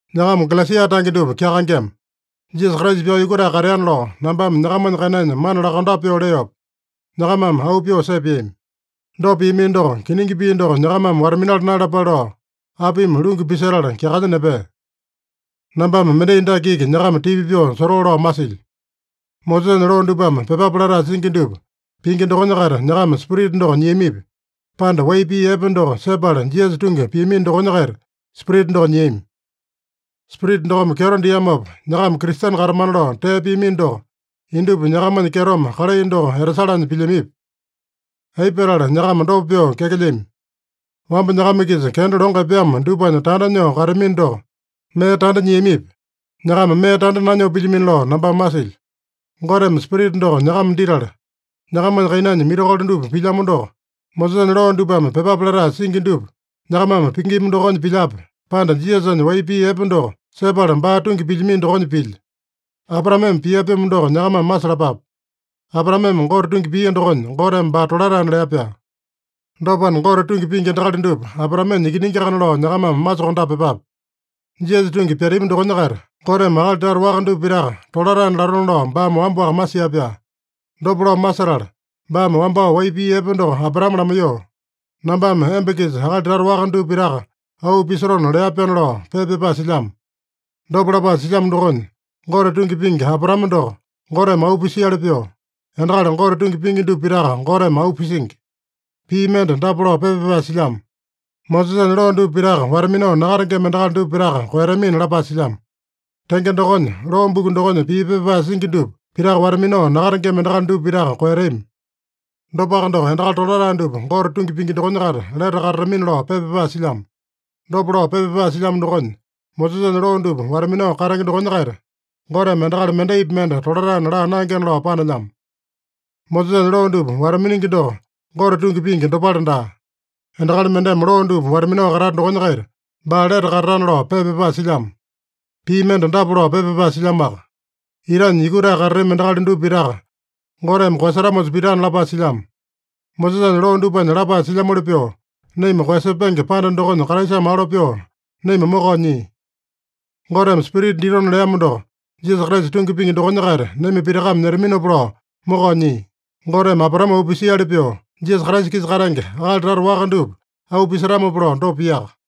Nyakama Galesia tange dupa kyakaengema! Jisasa Kraisa pyao yukutae kateana lao nambame nyakamanya kainanya mana lakondape pyoo leopa, nyakamame auu pyoo sepeami. Dopa piamino doko, kiningi pii doko nyakamame wata-minala naeyalapale lao, apimi lungu pisetala kyakanya nepea? Nambame mendai dake iki nyakama tipa pyoo sotoo lao masilyo: Mosesanya loo dupame pyepape latae singi dupa pingi dokonya-kaita nyakama Spirita doko nyiamipi, pande wai pii epe doko sepala Jisasa tungi piamino dokonya-kaita Spirita doko nyiami? Spirita dokome kyeto diamopa, nyakama Kristene katamana lao tee piamino doko, indupa nyakamanya kyetome kalai doko etasalanya pilyamipi? Aipa petala nyakama dopa pyoo kyakelyami? Wamba nyakama-kisa kenda longo epeamo dupanya tanda nyoo kateamino doko, mee tanda nyiamipi? Nyakama mee tanda nanyoo pilyamino lao nambame masilyo. Goteme Spirita doko nyakama ditala, nyakamanya kainanya mirakolo dupa pilyamo doko, Mosesanya loo dupame pyepape latae singi dupa nyakamame pingima dokonya pilyape, pande Jisasanya wai pii epe doko sepala baa tungi pilyamino dokonya pilya? Abraameme pia-pyomo doko nyakamame masalapape: Abraameme Gote tungi pia dokonya, Goteme baa tolataena lea-pyaa. Dopana, Gote tungi pingi endakali dupa Abraamenya ikiningiakana lao nyakamame masokondape pyepape. Jisasa tungi pyatami dokonya-kaita Goteme akali tata waka dupa pitaka tolataena latona lao baame wamba-waka masia-pyaa. Dopa lao masetala, baame wambao wai pii epe doko Abraame lamaiyoo, “Nambame emba-kisa akali tata waka dupa pitaka auu pisotona” lea-pyaana lao pepa pyapae silyamo. Dopa lapae silyamo dokonya, Gote tungi pingi Abraame doko Goteme auu pisiali pyoo, endakali Gote tungi pingi dupa pitaka Goteme auu pisingi. Pii mende dapa lao pepa pyapae silyamo: “Mosesanya loo dupa pitaka wata-minao nakatengema endakali dupa pitaka koeyatamina” lapae silyamo. Tenge dokonya, loo buku dokonya pii pepa pyapae singi dupa pitaka wata-minao nakatengema endakali dupa pitaka koeyatami. Dopaka doko, “Endakali tolatae dupa Gote tungi pingi dokonya-kaita lete katatamina” lao pepa pyapae silyamo. Dopa lao pepa pyapae silyamo dokonya, Mosesanya loo dupa wata-minao katenge dokonya-kaita Goteme endakali mendaipi mende tolataena laa naengena lao panelyamo. Mosesanya loo dupa wata-miningi doko Gote tungi pingi dopale daa. “Endakali mendeme loo dupa wata-minao katata dokonya-kaita baa lete katatana” lao pepa pyapae silyamo. Pii mende dapa lao pepa pyapae silyamoaka: “Itanya yukutae katatami endakali dupa pitaka Goteme koeyasetamosa pitana” lapae silyamo. Mosesanya loo dupanya lapae silyamoli pyoo, naima koeyasepenge panda dokonya Kraisame alo pyoo naima mokao nyia. Goteme Spirita ditona leamo doko Jisasa Kraisa tungi pingi dokonya-kaita naima pitakame nyetaminopa lao mokao nyia. Goteme Abraame auu pisiali pyoo, Jisasa Kraisa-kisa katenge akali tata waka dupa auu pisetamopa lao dopa piaka.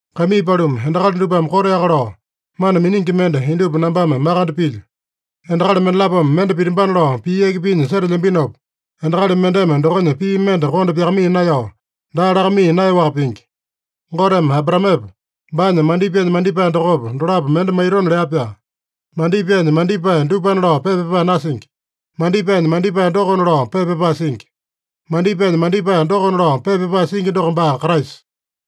Kaimii paluma, endakali dupame koteaka lao mana miningi mende indupa nambame makande pilyo. Endakali mendalapome mende pitambana lao pii yaki pinya setelyambinopa, endakali mendeme dokonya pii mende konda pyakamaiya naeyao, daa lakamaiya naeyaowaka pingi. Goteme Abraamepa, baanya mandipaenya mandipae dokopa, dolapo mende maitona lea-pyaa. “Mandipaenya mandipae dupana” lao pepa pyapae nasingi. “Mandipaenya mandipae dokona” lao pepa pyapae singi. “Mandipaenya mandipae dokona” lao pepa pyapae singi doko baa Kraisa.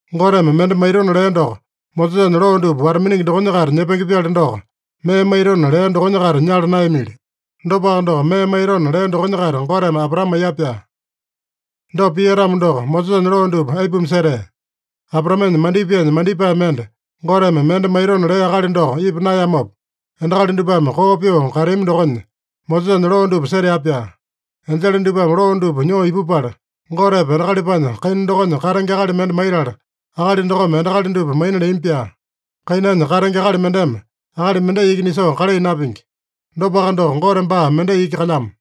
Goteme mende maitona lea doko Mosesanya loo dupa wata-miningi dokonya-kaita nyepenge-pyali doko, mee maitona lea dokonya-kaita nyala naeyamili. Dopaka doko, mee maitona lea dokonya-kaita Goteme Abraame maiya-pyaa. Dopa pia-tamo doko, Mosesanya loo dupa aipuma setea? Abraamenya mandipaenya mandipae mende, Goteme mende maitona lea akali doko ipa naeyamopa, endakali dupame koo pyoo kateami dokonya, Mosesanya loo dupa setea-pyaa. Enjele dupame loo dupa nyoo ipupala, Gotepa, endakalipanya kaina dokonya katenge akali mende maitala, akali dokome endakali dupa maina leami-pyaa. Kainanya katenge akali mendeme akali mendai iki nisoo kalai napingi. Dopaka doko, Gote baa mendai iki kalyamo.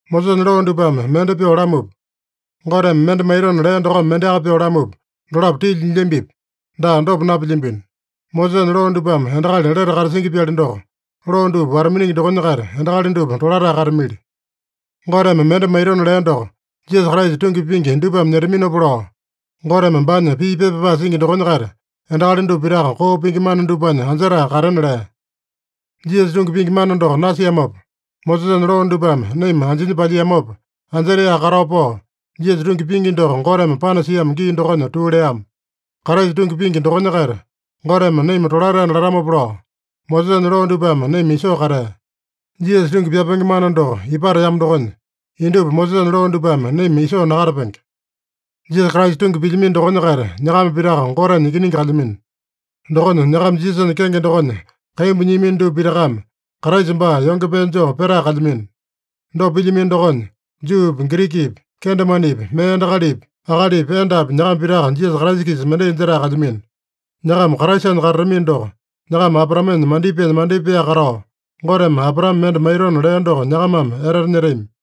Mosesanya loo dupame mende pyoo lamupa, Goteme mende maitona lea dokome mendeaka pyoo lamupa, dolapo tilya nyilyambipi? Daa, dopa napilyambino. Mosesanya loo dupame endakali lete katasingi-pyali doko, loo dupa wata-miningi dokonya-kaita endakali dupa tolatae katamili. Goteme mende maitona lea doko Jisasa Kraisa tungi pingi dupame nyetaminopa lao, Goteme baanya pii pepa pyapae singi dokonya-kaita, endakali dupa pitaka koo pingi mana dupanya anjetae katena lea. Jisasa tungi pingi mana doko nasiamopa, Mosesanya loo dupame naima anjinya palyiamopa, anjetaeyaka katao pao, Jisasa tungi pingi doko Goteme panasiamo gii dokonya tuu leama. Kraisa tungi pingi dokonya-kaita Goteme naima tolataena latamopa lao, Mosesanya loo dupame naima isoo katea. Jisasa tungi pyapenge mana doko ipateamo dokonya, indupa Mosesanya loo dupame naima isoo nakatapenge. Jisasa Kraisa tungi pilyamino dokonya-kaita, nyakama pitaka Gotenya ikiningi kalyamino. Dokonya nyakama Jisasanya kenge dokonya kaimbu nyiamino dupa pitakame Kraisa baa yonge pee joo petae kalyamino. Dopa pilyamino dokonya, Juupi, Girikipi, kendemanepi, mee endakalipi, akalipi, endapi, nyakama pitaka Jisasa Kraisa-kisa mendai jetae kalyamino. Nyakama Kraisanya katatamino doko, nyakama Abraamenya mandipaenya mandipaeyaka katao, Goteme Abraame mende maitona lea doko nyakamame etete nyetami.